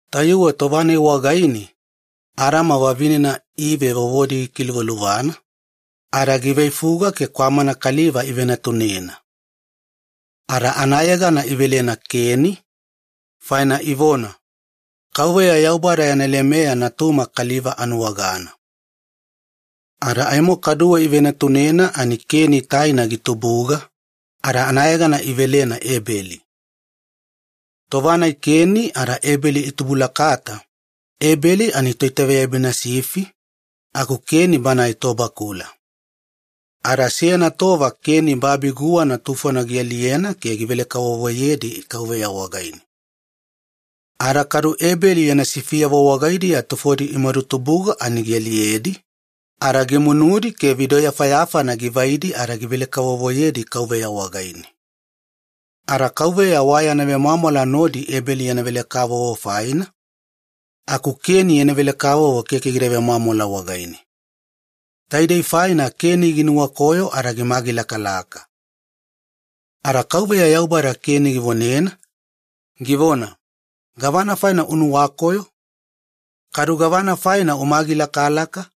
Tayuwe tova-nai wagaine Adama vavinena Ive vovona gikiluvaluvana ada giveifuga ke kwamana kaliva ivenatunena. Ada anayegana idouwena Keni, faina ivona, “Yaubada yana lemeya natuma kaliva anuwagana.” Muliya taina kwamana kaliva ivenatunena ada anayegana idouwena Ebeli. Tova-nai Keni ada Ebeli itubulakata, Ebeli ani givetoitaveyabina sifi aku Keni banae tobakula. Ada seyana tova Keni babi guwana tufona gialiyena ke givele-kavovoyedi Yaubada wagaine. Ada kadu Ebeli yana sifiyavo wagaidiya tufodi imadutubuga ani gialiyedi ada gimunudi ke vidoyafayafana givaidi ada givele-kavovoyedi Yaubada wagaine. Ada Yaubada wayana vemwamwala nodi Ebeli yana vele-kavovo faina, aku Keni yana vele-kavovo keke gida vemwamwala wagaine. Taidei faina Keni ginuwakoyo ada gimagilakalaka. Ada Yaubada Keni givonena, givona, “Gavana faina unuwakoyo? Kadu gavana faina umagilakalaka?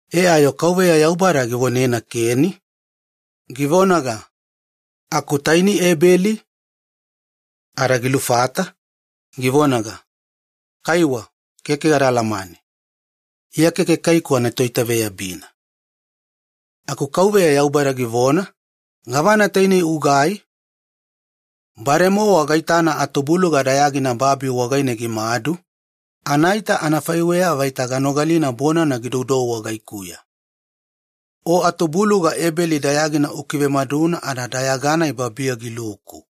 E ada kaduwe Yaubada givonena Keni, “Aku taini, Ebeli?” Ada gilufata Yaubada wagaine, givonaga, “Kaiwa, keke gada alamane. Iya keke kaiku anatoitaveyabina.” Ada Yaubada givona-vagila, “Gavana tainei ugai? Bademowa gaitana atubuluga dayagina babi wagaine gimadu, anaita anafaiweya vaita ganogalina bonana gidoudou wagaikuya. E ada taidei aalatabutabu babi wagaine una nuwagana faina atubuluga Ebeli dayagina ukivemaduna ada dayaga-nai babiya giluku.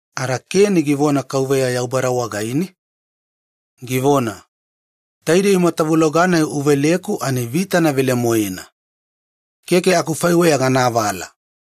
Ada Keni givona Yaubada wagaine, “Taidei matavuloga-nai uveleku ani vitana velemoena ada keke akufaiweya gana avala.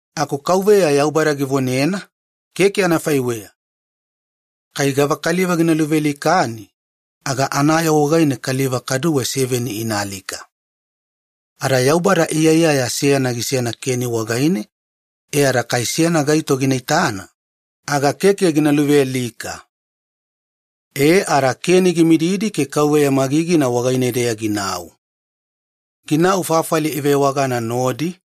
Aku Yaubada givonena, “Keke anafaiweya. Kai gava kaliva gina luvealikani, aga anayoo wagaine kaliva kaduwe seveni inaalika.” Ada Yaubada iyaiyaya seyana gisena Keni wagaine ada keke seyana gaito gina luvealika kai gina nuwagana. E ada Keni gimididi ke Yaubada magigina wagaine-deya ginau. Ginau fafali ivewagana Nodi,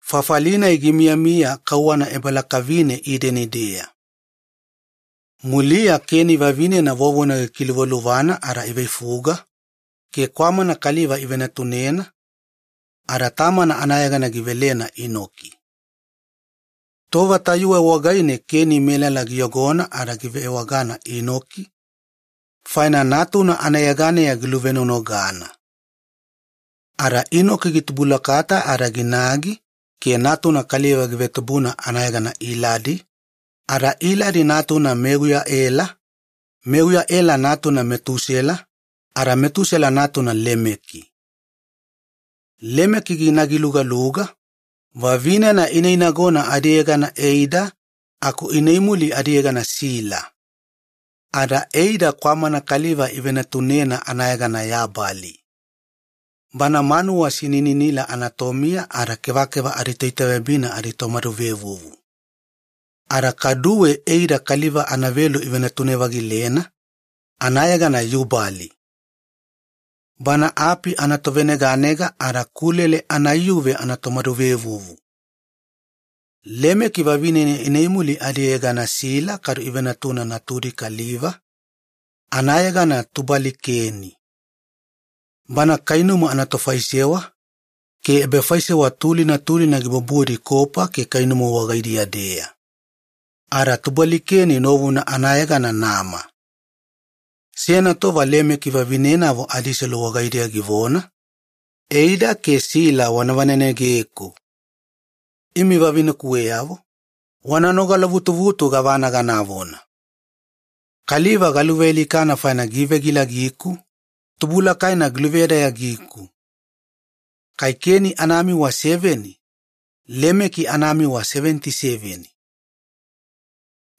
fafali-nai gimiyamiya kauwana ebalakavine Ideni-deya. Muliya Keni vavinena vovona gikiluvaluvana ada iveifuga, ke kwamana kaliva ivenatunena ada tamana anayegana gidouwena Inoki. Tova tayuwe wagaine Keni melala giyogona ada givewagana Inoki faina natuna anayeganeya giluvenonogana. Ada Inoki gitubulakata ada ginagi ke natuna kaliva givetubuna anayegana Iladi, ada Iladi natuna Meuyaela, Meuyaela natuna Metusela, ada Metusela natuna Lemeki. Lemeki ginagi lugaluga, vavinena ineinagona adiyegana Eida aku ineimuli adiyegana Sila. Ada Eida kwamana kaliva ivenatunena anayegana Yabali. Bana manuwa sinininila anatomiya ada kevakeva aditoitaveyabina aditomaduvevuvu. Ada kaduwe Eida kaliva anavelu ivenatune-vagilena, anayegana Yubali. Bana api anatoveneganega ada kulele anaiyuve anatomaduvevuvu. Lemeki vavinena ineimuli adiyegana Sila kadu ivenatuna natudi kaliva, anayegana Tubali-Keni. Bana kainumu anatofaisewa ke ebafaisewa tulina tulina gibubudi kopa ke kainumu wagaidiya-deya. Ada Tubali-keni novuna anayegana Nama. Seyana tova Lemeki vavinenavo adiselu wagaidiya givona, “Eida ke Sila wana vanenegeku. Imi vavinekuweyavo, wana nogala-vutuvutu gavana ganavona. Kaliva galuvealikana faina givegilagiku, tubulakaina giluvedayagiku. Kai Keni anamiwa seveni, Lemeki anamiwa seveniti seveni.”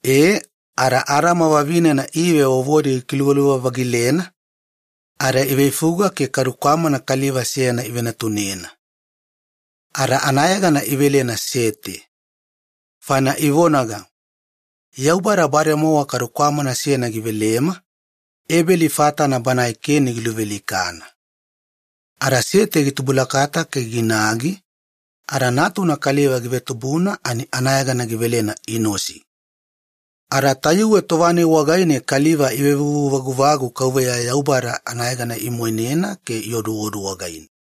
E, ada Adama vavinena Ive vovodi gikiluvaluva-vagilena ada iveifuga ke kwamana kaliva velugana ivenatunena. Ada idouwena anayegana Sete, faina ivonaga, “Yaubada bademowa kwamana velugana givelema, Ebeli fatana banae Keni giluvealikana.” Ada Sete gitubulakata ke ginagi ada natuna kaliva givetubuna ani anayegana gidouwena Inosi. Ada tayuwe tova-nai wagaine kaliva ivevuvu-vaguvagu Yaubada anayegana imoinena ada ioduodu wagaine.